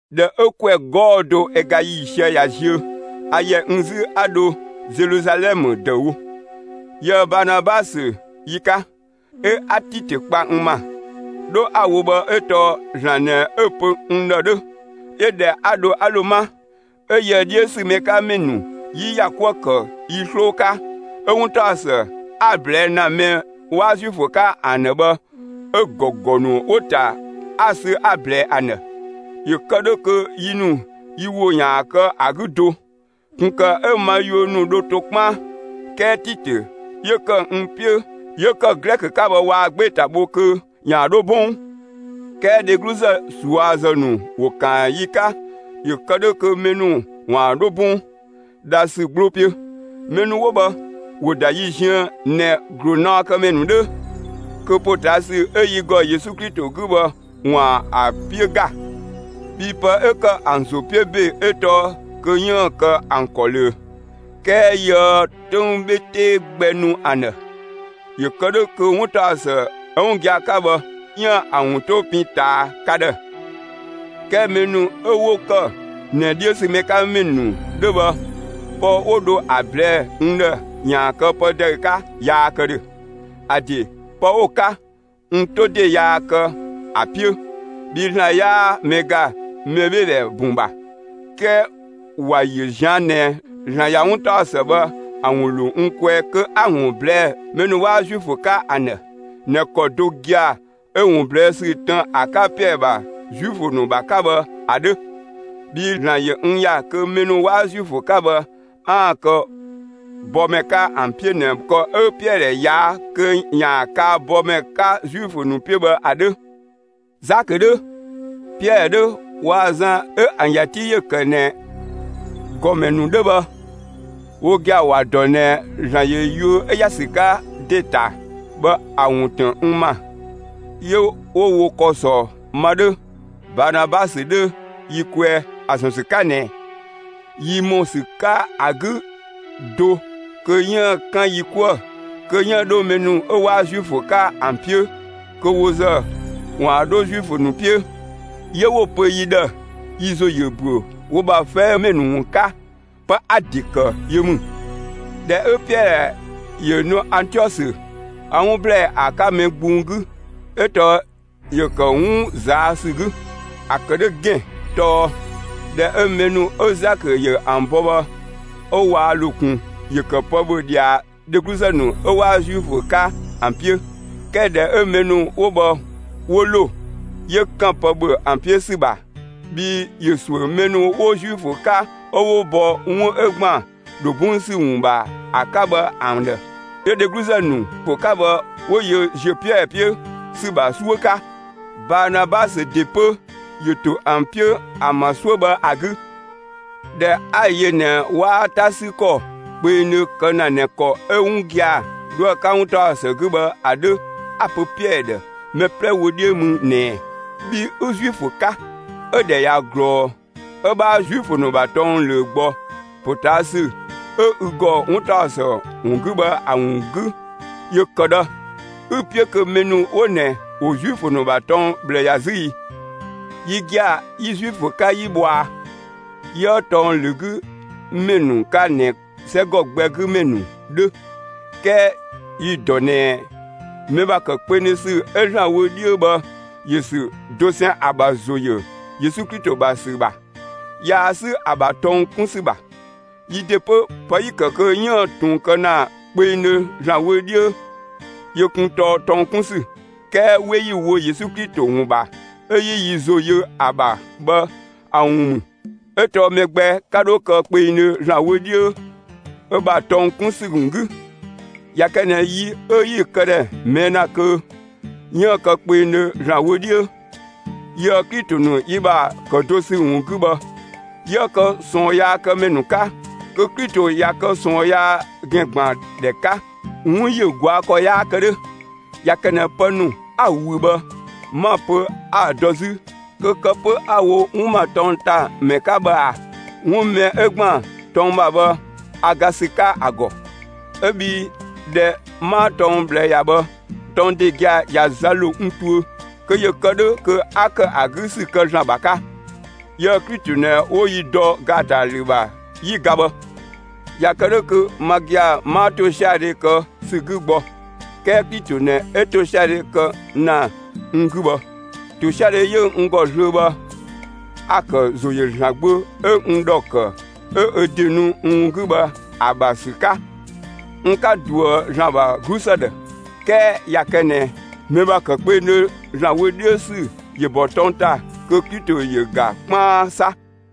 ꞊Dhɛ 'ö ‑kwɛ 'gɔɔ‑ do ö ga ‑yiisië ꞊ya ziö, a ‑yɛ n 'zü 'a dho Zeluzalɛmë ‑dëüwo, yië‑ Baanabasö yi 'ka, 'ö 'a Titö kpa n ‑ma. 'Dho 'a‑ wo bhë 'ö tɔɔ ‑Zlan ꞊nɛ 'ö‑ pö n ‑dhë 'dhö. 'Yö ꞊dhɛ 'a dho 'a ‑lo 'ma, 'ö yië‑ 'dhiö ‑sü mɛ 'ka ‑mɛ ‑nu 'yi ‑ya 'kuë‑ ‑kë yi 'sloo 'ka, 'ö 'wuntaɔsë 'a‑ ꞊blɛɛ' ‑na mɛ 'waa Zuifö 'ka ‑an ‑dhë bhë, 'ö‑ ‑gɔgɔ ‑nu 'wo‑ ‑ta, 'a‑ sü 'a‑ ꞊blɛɛ ‑an ‑dhë; ‑yö ‑kë 'dhö kö yi ‑nu yi ‑wo ‑yaan kë ‑a 'gü do, ꞊kun ‑kë 'ö ma yuö ‑nu dho to 'kpaan. 'Kɛɛ Titö, 'yö ‑kë n 'piö, 'yö ‑kë Glɛkö 'ka bhë waa‑ 'gbee‑ ‑ta bho kö ‑yaan 'dho 'bɔng. 'Kɛɛ dhegluzë ꞊suazë ‑nu ‑wo ‑kaan yi 'ka ‑yö kë 'dhö kö mɛ ‑nu ‑waan 'dho 'bɔng, dhasü 'gbloo 'piö. Mɛ ‑nu 'wo bhë, ‑wo ‑da yi ziën ꞊nɛ ‑glunaɔkëmɛ ‑nu 'dhö kö ‑potaasü 'ö yi ‑gɔ Yesu Klito 'gü bhë ‑waan ‑a 'piö ‑ga; bhii pë 'ö ‑kë ‑an ‑zo 'piö ‑be 'ö tɔɔ kö 'yiën‑ kë ‑an ‑kɔ ꞊löö. 'Kɛɛ yiëë 'töng 'bhe 'tee gbɛ nu ‑an ‑dhë, ‑yö kë 'dhö kö 'wuntaɔsë 'ö 'wun gia‑ 'ka bhë 'yiën‑ ‑a ‑wun 'to pin ꞊taa ka ‑dhë. 'Kɛɛ mɛ ‑nu 'ö 'wo ‑kë ꞊nɛ 'dhiö ‑sü mɛ 'ka ‑mɛ ‑nu 'dhö bhë, pë 'wo dho ‑a ꞊blɛɛ'‑ n ‑dhë ‑yaan kë pë ‑dëü 'ka yaa kë ‑dhö. ‑A ‑de pë 'wo‑ 'ka, n 'to ‑de yaa kë ‑a 'piö, bhii ‑Zlan 'yaa mɛ ‑ga mɛbheedhɛ bun ‑bha. 'Kɛɛ ‑wa ‑yö ꞊zian' ꞊nɛ ‑Zlan ꞊ya 'wuntaɔsë bhë ‑a ‑wun ‑lo n kwɛɛ kö 'a‑ ‑wun ꞊blɛɛ'‑ mɛ ‑nu 'waa Zuifö 'ka ‑an ‑dhë ꞊nɛ ‑kɔ do gia‑ 'ö‑ ‑wun ꞊blɛɛ' ‑sü tën ‑a 'ka Piɛɛ ‑bha Zuifö ‑nu ‑bha 'ka bhë ‑a 'dhö, bhii ‑Zlan ‑yö n ‑ya kö mɛ ‑nu 'waa Zuifö 'ka bhë 'aan‑ kë bɔmɛ 'ka ‑an 'piö ꞊nɛ ‑kɔ 'ö Piɛɛ ꞊yaa' kö ‑yaan kaa bɔmɛ 'ka Zuifö ‑nu 'piö bhë ‑a 'dhö. Zakö 'dhö, Piɛɛ 'dhö waa‑ Zan 'ö ‑an ‑ya 'ti ‑yö ‑kë ꞊nɛ ‑gɔmɛ ‑nu 'dhö bhë, wo gia‑ ‑wa ‑dɔ ꞊nɛ ‑Zlan ‑yö yuö 'ö ‑ya ‑sü 'ka ‑de ‑ta bhë ‑a ‑wun ‑tën n ‑ma. 'Yö 'wo wo ‑kɔ ‑sɔ ma 'dhö, Baanabasö 'dhö yi kwɛɛ, ‑a ‑zɔn ‑sü 'ka ꞊nɛ yi ‑mɔ ‑sü 'ka ‑a 'gü do kö 'yiën‑ 'kan yi 'kuë‑ kö 'yiën‑ 'dho mɛ ‑nu 'waa Zuifö 'ka ‑an 'piö, kö wo ‑zë ‑waan 'dho Zuifö ‑nu 'piö. 'Yö 'wo‑ pö yi ‑dhë yi ‑zo ‑yö ‑büö wo ‑bha 'fɛɛmɛ ‑nu ‑wun 'ka. Pë 'a‑ ‑de ‑kë yö ‑mü. ꞊Dhɛ 'ö Piɛɛ ‑yö nu Antiɔsö, a 'wun ‑blɛɛ ‑a 'ka mɛ gbung 'gü 'ö tɔɔ ‑yö ‑kë 'wun ꞊zaa' ‑sü 'gü. ‑A ‑kë 'dhö ‑gɛn tɔɔ: ꞊Dhɛ 'ö mɛ ‑nu 'ö Zakö ‑yö ‑an bɔ bhë 'ö waa ‑lo ꞊kun, ‑yö ‑kë pë ‑bhö ꞊dhia dhegluzë ‑nu 'ö 'waa Zuifö 'ka ‑an 'piö; 'kɛɛ ꞊dhɛ 'ö mɛ ‑nu 'wo bhë 'wo ‑lo, 'yö ‑kan pë ‑bhö ‑an 'piö ‑sü ‑bha, bhii ‑yö ‑suö mɛ ‑nu 'wo Zuifö 'ka 'ö 'wo bɔ 'wun 'ö ‑gban ‑dho 'bɔng ‑sü ‑wun ‑bha ‑a 'ka bhë ‑an ‑dhë. 'Yö dhegluzë ‑nu 'wo Zuifö 'ka bhë, 'wo yö ‑ziö Piɛɛ 'piö ‑sü ‑bha 'suö 'ka. Baanabasö ‑de 'pö ‑yö ‑to ‑an 'piö ‑an ‑bha 'suö bhë ‑a 'gü. ꞊Dhɛ 'a‑ yö ꞊nɛ 'waa 'ta 'sü ‑kɔ kpengdhö kë ‑na ꞊nɛ ‑kɔ 'ö 'wun gia‑ 'dhoë‑ 'ka 'wuntaɔsë 'gü bhë ‑a 'dhö, 'a‑ pö Piɛɛ ‑dhë mɛ 'plɛ wö 'dhiö mü ꞊nɛɛ: «Bhi 'ü Zuifö 'ka, 'ö‑ ‑dhɛ ꞊ya ꞊glɔɔ 'ö 'bhaa Zuifö ‑nu ‑bha tɔng ꞊löö gbɔ ‑potaasü 'ö ü ‑gɔ 'wuntaɔsë ‑wun 'gü bhë ‑a ‑wun 'gü, ‑yö ‑kë ꞊dhë 'ü‑ 'piö kö mɛ ‑nu 'wo ꞊nɛ ‑wo Zuifö ‑nu ‑bha tɔng ꞊bhlë ‑ya 'zü ii?» Yi gia‑ 'yi Zuifö 'ka 'yi bhɔa, 'yiëë tɔng ‑lö 'gü ‑mɛ ‑nu 'ka ꞊nɛ 'sɛgɔ gbɛ 'gü ‑mɛ ‑nu 'dhö. 'Kɛɛ yi‑ ‑dɔ ꞊nɛ mɛ ‑bha ‑kë kpengdhö ‑sü 'ö ‑Zlan wö 'dhiö bhë ‑yö ‑sü dosɛn ‑a ‑bha ‑zo ‑yö Yesu Klito ‑bha ‑sü ‑bha, yaa 'sü ‑a ‑bha tɔng 'kun ‑sü ‑bha. Yi ‑de 'pö, pë 'yi‑ ‑kë kö 'yiën‑ ꞊tun kë ‑na kpengdhö ‑Zlan wö 'dhiö yö kun tɔɔ tɔng 'kun ‑sü; 'kɛɛ 'we 'yi‑ wo Yesu Klito ‑wun ‑bha 'ö 'yi yi ‑zo yö ‑a ‑bha bhë ‑a ‑wun ‑mü; 'ö tɔɔ mɛ gbɛ 'ka 'dho kë kpengdhö ‑Zlan wö 'dhiö ö ‑bha tɔng 'kun ‑sü ‑wun 'gü. ꞊Ya kë ꞊nɛ yi 'ö 'yi‑ këdhɛ ꞊mɛɛ' ‑na kö 'yiën‑ kë kpengdhö ‑Zlan wö 'dhiö, yiëë‑ Klito ‑nu yi ‑bha ‑kë do ‑sü ‑wun 'gü bhë, 'yië kë ꞊sɔɔnyaakëmɛ ‑nu 'ka, kö Klito ꞊ya kë ꞊sɔɔn yaa ‑gɛn ‑gban ‑dhɛ 'ka; 'wun ‑yö ꞊gɔa' ‑kɔ 'yaa kë 'dhö! ꞊Ya kë ꞊nɛ pë ‑nu 'a‑ ꞊wüü bhë, 'ma‑ pö 'a‑ dɔ 'zü, kö kë 'pö 'a‑ wo 'wun ‑ma tɔng ‑ta ‑mɛ 'ka bhë ꞊aa? 'Wun mɛ 'ö ‑gban tɔng ‑bha bhë, a ga ‑sü 'ka ‑a ‑gɔ, 'ö bhii ꞊dhɛ 'maa tɔng ꞊bhlë ‑ya bhë, tɔng ‑de gia‑ ꞊ya za ‑lo n tuö, kö ‑yö kë 'dhö kö 'a ‑kë ‑a 'gü ‑sü kë ‑Zlan ‑bha 'ka. Yië‑ Klito ꞊nɛ 'wo yi dɔ ‑gaatalü ‑bha, 'yi ga bhë; ꞊ya kë 'dhö kö ma gia‑ 'maa ‑tosiadhe kë ‑sü 'gü gbɔ, 'kɛɛ Klito ꞊nɛ 'ö ‑tosiadhe kë ‑na n 'gü bhë. ‑Tosiadhe 'yö n ‑gɔ zlöö bhë, a‑ ‑kë ‑zo ‑yö ‑Zlan Gbö 'ö n ‑dhɔ ‑kë 'ö ö ‑de nu n ‑wun 'gü bhë ‑a ‑bha ‑sü 'ka. N 'ka ꞊duë ‑Zlan ‑bha 'glusë ‑dhë. 'Kɛɛ ꞊ya kë ꞊nɛ mɛ ‑bha ‑kë kpengdhö ‑Zlan wö 'dhiö ‑sü ‑yö ‑bɔ tɔng ‑ta, kö Klito ‑yö ‑ga 'kpaan 'sa!